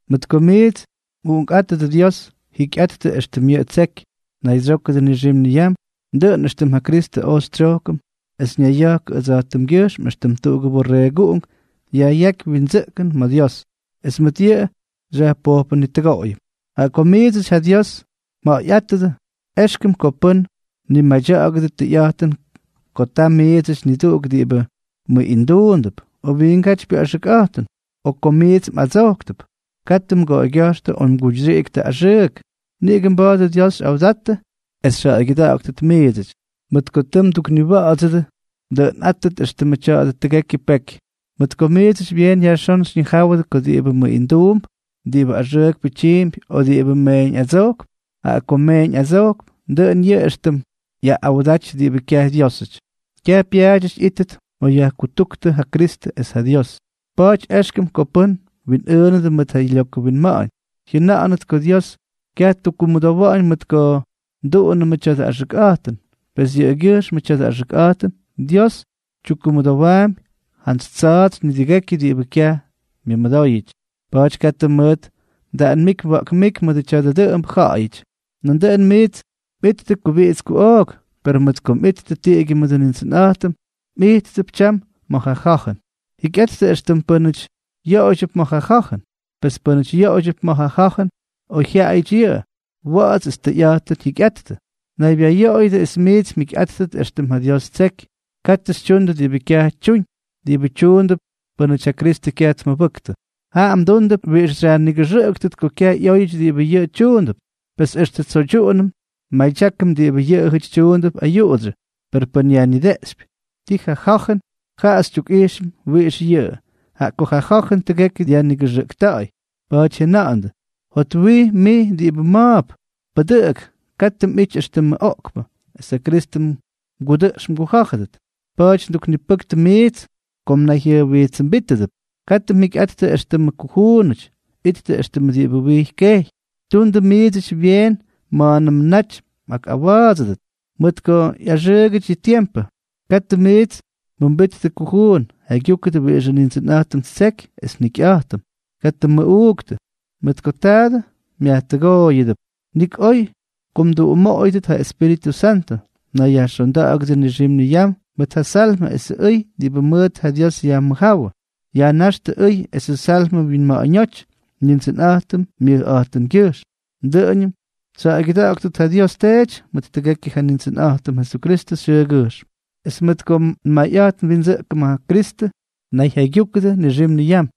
Mʉt ko miits mꞌuꞌunkꞌátʉdʉ Dios, jikyꞌattʉ éxtʉm yʉꞌʉ ttseky. Naydsyókʉdʉ nixim niyam, dʉꞌʉn éxtʉm ja Kristʉ oj xytsyojkʉm es ñayya̱jkʉ ʉdsa̱jtʉmgyʉjxm éxtʉm tuꞌugʉ borreeguꞌunk yajꞌyáky windsʉꞌkʉn ma̱ Dios, es mʉt yʉꞌʉ xyajpojpʉnitʉgoꞌoyʉm. Jaꞌa ko miidsʉty ja Dios mja̱ꞌa̱yꞌátʉdʉ, éxkʉm ko pʉ́n mnimadya̱ꞌa̱gʉdʉ tʉyꞌa̱jtʉn ko ta miidsʉty niduꞌuk diꞌibʉ mʉꞌinduundʉp, o wiingátypyʉ axʉkꞌa̱jtʉn, o ko miits mꞌadsojktʉp. Katʉ mgoꞌoygya̱jxtʉ o mguyxyiꞌiktʉ axʉʉk, niꞌigʉ mba̱a̱dʉ Dios xyꞌawdattʉ es xyjaꞌaygyʉda̱ꞌa̱ktʉt miidsʉty, mʉt ko tʉ mdukniwa̱ꞌa̱dsʉdʉ es kyaj mdʉꞌʉnꞌáttʉ éxtʉmʉ tya̱dʉ tʉgekyʉ peky. Mʉt ko miidsʉty byeen yajxón xyñijáwʉdʉ ko diꞌibʉ mʉꞌinduump, diꞌibʉ axʉʉkpʉ tyiimpy o diꞌibʉ meeñꞌadsojkp (jaꞌa ko meeñꞌadsojk, dʉꞌʉn yʉꞌʉ éxtʉm yaꞌꞌawdaty diꞌibʉ kyaj Dyiósʉty), kyaj pyaadyʉty ꞌyíttʉt ma̱ yajkutúktʉ ja Kristʉ es ja Dios. Pa̱a̱ty éxkʉm ko pʉ́n mwinꞌʉʉnʉdʉ mʉt ja lyokʉ winma̱ꞌa̱ñ, jyʉna̱ꞌa̱nʉt ko Dios kyaj tyukkumʉdowa̱ꞌa̱ñ mʉt ko nduꞌunʉmʉ tya̱dʉ axʉkꞌa̱jtʉn, pes yʉꞌʉgyʉjxmʉ tya̱dʉ axʉkꞌa̱jtʉn Dios tyukkumʉdowaampy jantsy tsa̱a̱tsy nidʉgekyʉ diꞌibʉ kyaj myʉmʉdóyʉty. Pa̱a̱ty katʉ mʉʉt mdaꞌanmíky mwa̱ꞌkmíky mʉdʉ tya̱dʉ dʉꞌʉmbʉ ja̱ꞌa̱yʉty. Nandʉꞌʉn miits mꞌijttʉ kubiꞌits kuꞌook, per mʉt ko mꞌittʉ tiꞌigyʉ mʉdʉ Nindsʉnꞌa̱jtʉm, mꞌijttʉp tyam ma̱ ja ja̱jʉn. Jikyꞌattʉ éxtʉmʉ pʉ́nʉty yoꞌoydyʉp ma̱ ja ja̱jʉn, pes pʉ́nʉty yoꞌoydyʉp ma̱ ja ja̱jʉn, oyjyaꞌayʉty yʉꞌʉ, wa̱ꞌa̱ts es tʉyꞌa̱jtʉn jyikyꞌattʉ. Naybyayoꞌoydyʉ es miits mjikyꞌáttʉt éxtʉm ja Dios ttseky. Katʉ xytyundʉ diꞌibʉ kyaj tyuñ, diꞌibʉ tyuundʉp pʉ́nʉty ja Kristʉ kyaj tmʉbʉktʉ, jaꞌa mdúndʉp wiꞌix xyajnigʉxʉꞌʉktʉt ko kyaj ꞌyóyʉty diꞌibʉ yʉꞌʉ tyuundʉp. Pes extʉ tsoydyuꞌunʉm nmadyákʉm diꞌibʉ yʉꞌʉjʉty tyuundʉp ayuꞌudsyʉ; per pʉn yajnideꞌxypy tii ja ja̱jʉn, jaꞌa xytyukꞌijxʉm wiꞌix yʉꞌʉ, jaꞌa ko ja ja̱jʉn tʉgekyʉ dyajnigʉxʉꞌkta̱ꞌa̱y. Pa̱a̱ty jyʉna̱ꞌa̱ndʉ: Jotwij, mij diꞌibʉ ma̱a̱p, pʉdʉꞌʉk, katʉ mꞌity éxtʉmʉ oꞌkpʉ, es ja Kristʉ mgudʉꞌx mgujá̱jʉdʉt. Pa̱a̱ty nduknipʉktʉ miits ko mnayjyʉjwijtsʉmbítʉdʉp. Katʉ mjikyꞌattʉ éxtʉmʉ kujuunʉty; ittʉ éxtʉmʉ diꞌibʉ wijy kejy. Tundʉ miidsʉty byeen ma̱a̱nʉmʉ naty mꞌawa̱a̱dsʉdʉt, mʉt ko ꞌyaxʉʉgʉty yʉ tiempʉ. Katʉ miits mjʉmbittʉ kujuun. Jaygyúkʉdʉ wiꞌixʉ Nindsʉnꞌa̱jtʉm ttseky es njikyꞌa̱jtʉm. Katʉ mmʉꞌuuktʉ, mʉt ko taadʉ myajtʉgooyʉdʉp, nik oy ko mduꞌumoꞌoyʉdʉt ja Espíritʉ Santʉ. Nayyajxonda̱ꞌa̱gʉdʉ nixim niyam mʉt ja Salmʉ esʉ ʉy diꞌibʉ mʉʉt ja Dios yajmʉjjáwʉ, yajnáxtʉ ʉy esʉ Salmʉ mwinma̱ꞌa̱ñóty Nindsʉnꞌa̱jtʉm myʉjꞌa̱jtʉngyʉjxm. Dʉꞌʉñʉm xyjaꞌaygyʉda̱ꞌa̱ktʉt ja Dios Teety mʉt tʉgekyʉ ja Nindsʉnꞌa̱jtʉm Jesukristʉ xyʉʉgyʉjxm. Es mʉt ko nmayꞌa̱jt nwindsʉꞌkʉm ja Kristʉ, nayjaygyúkʉdʉ nixim niyam.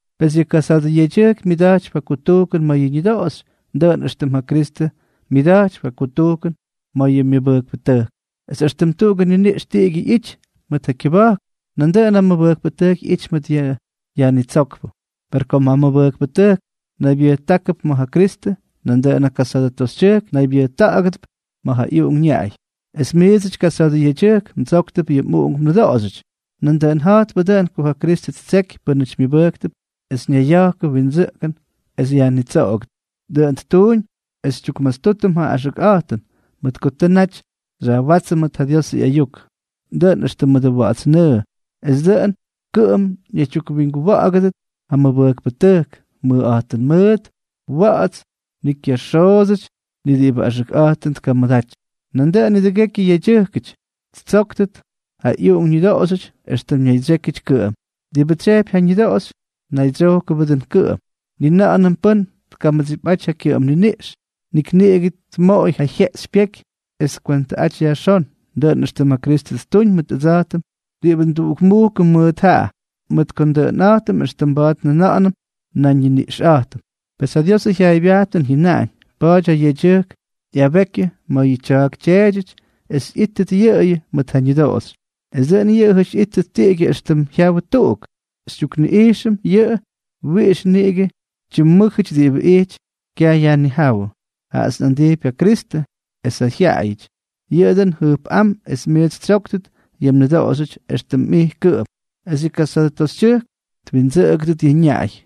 Pes yʉ kasa̱a̱dʉ yedyʉjk myʉda̱jtypy ja kutujkʉn ma̱ yʉ ñʉdoꞌoxy dʉꞌʉn éxtʉm yʉ Kristʉ myʉda̱jtypy ja kutujkʉn ma̱ yʉ mʉbʉjkpʉtʉjk, es éxtʉm tuꞌugʉ niniꞌx tiꞌigyʉ ꞌyity mʉt ja kyʉba̱jk, nandʉꞌʉn ja mʉbʉjkpʉtʉjk ꞌyity mʉt ja Yajnitsókpʉ. Per kom ja mʉbʉjkpʉtʉjk naygyʉbʉjkʉdʉp ma̱ ja Kristʉ, nandʉꞌʉn ja kasa̱a̱dʉ toxytyʉjk naygyubʉjkʉdʉp ma̱ ja ꞌyuꞌunk ñaꞌay. Es miidsʉty kasa̱a̱dʉ yedyʉjkʉty, mdsóktʉp yʉ mꞌuꞌunk mnʉdoꞌoxyʉty. Nandʉꞌʉn ja̱jtpʉ dʉꞌʉn ko ja Kristʉ ttsejky pʉ́nʉty myʉbʉjktʉp es ñayya̱jkʉ windsʉꞌkʉn es yajnitsoꞌogʉdʉt. Dʉꞌʉn ttuuñ es xytyukmastútʉm ja axʉkꞌa̱jtʉn, mʉt ko tʉ naty xyajwátsʉm mʉt ja Diosʉ ꞌyayuk, dʉꞌʉn éxtʉm mʉdʉ wa̱ꞌa̱ts nʉʉ, es dʉꞌʉn kʉꞌʉm ñaydyukwinguwa̱ꞌa̱gʉdʉt ja mʉbʉjkpʉtʉjk, mʉjꞌa̱jtʉn mʉʉt, wa̱ꞌa̱ts, ni kyaxoodsʉty, ni diꞌibʉ axʉkꞌa̱jtʉn tkamʉdaty. Nandʉꞌʉn nidʉgekyʉ yedyʉjkʉty ttsóktʉt ja ꞌyuꞌunk ñʉdoꞌoxyʉty éxtʉm ñaydsyékyʉty kʉꞌʉm. Diꞌibʉ tsyejpy ja ñʉdoꞌoxy, naydsyojkʉbʉ dʉꞌʉn kʉꞌʉm. Ni na̱ꞌa̱nʉm pʉ́n tkamʉdsipꞌaty ja kyʉꞌʉm niniꞌx, nik niꞌigʉ tmoꞌoy ja jyeꞌxypyéky es tkwentʉꞌaty yajxón, dʉꞌʉn éxtʉm ja Kristʉ ttuñ mʉt ʉdsa̱jtʉm diꞌibʉ nduꞌukmujkʉm mʉt jaꞌa, mʉt ko ndʉꞌʉnꞌa̱jtʉm éxtʉm mba̱a̱t njʉna̱ꞌa̱nʉm nan xyñiniꞌxꞌa̱jtʉm. Pes ja Diosʉ jyaaybyajtʉn jyʉnaꞌañ: “Pa̱a̱ty ja yedyʉjk ꞌyabekyʉ ma̱ yʉ tya̱a̱k tyeedyʉty es ꞌyítʉt yʉꞌʉyʉ mʉt ja ñʉdoꞌoxy, es dʉꞌʉn yʉꞌʉjʉty ꞌyíttʉt tiꞌigyʉ éxtʉm jyawʉ tuꞌuk.” Xytyukꞌijxʉm yʉꞌʉ wiꞌix niꞌigʉ tyimmʉ́jʉty diꞌibʉ ijty kyayajnijáwʉ. Jaꞌats nꞌa̱ndijpy ja Kristʉ es ja jyaꞌayʉty. Yʉꞌʉ dʉꞌʉn jʉjpꞌám es miits xytsóktʉt yʉ mnʉdoꞌoxy éxtʉm mij kʉꞌʉm, es yʉ kasa̱a̱dʉ toxytyʉjk twindsʉꞌʉgʉdʉt yʉ ñaꞌay.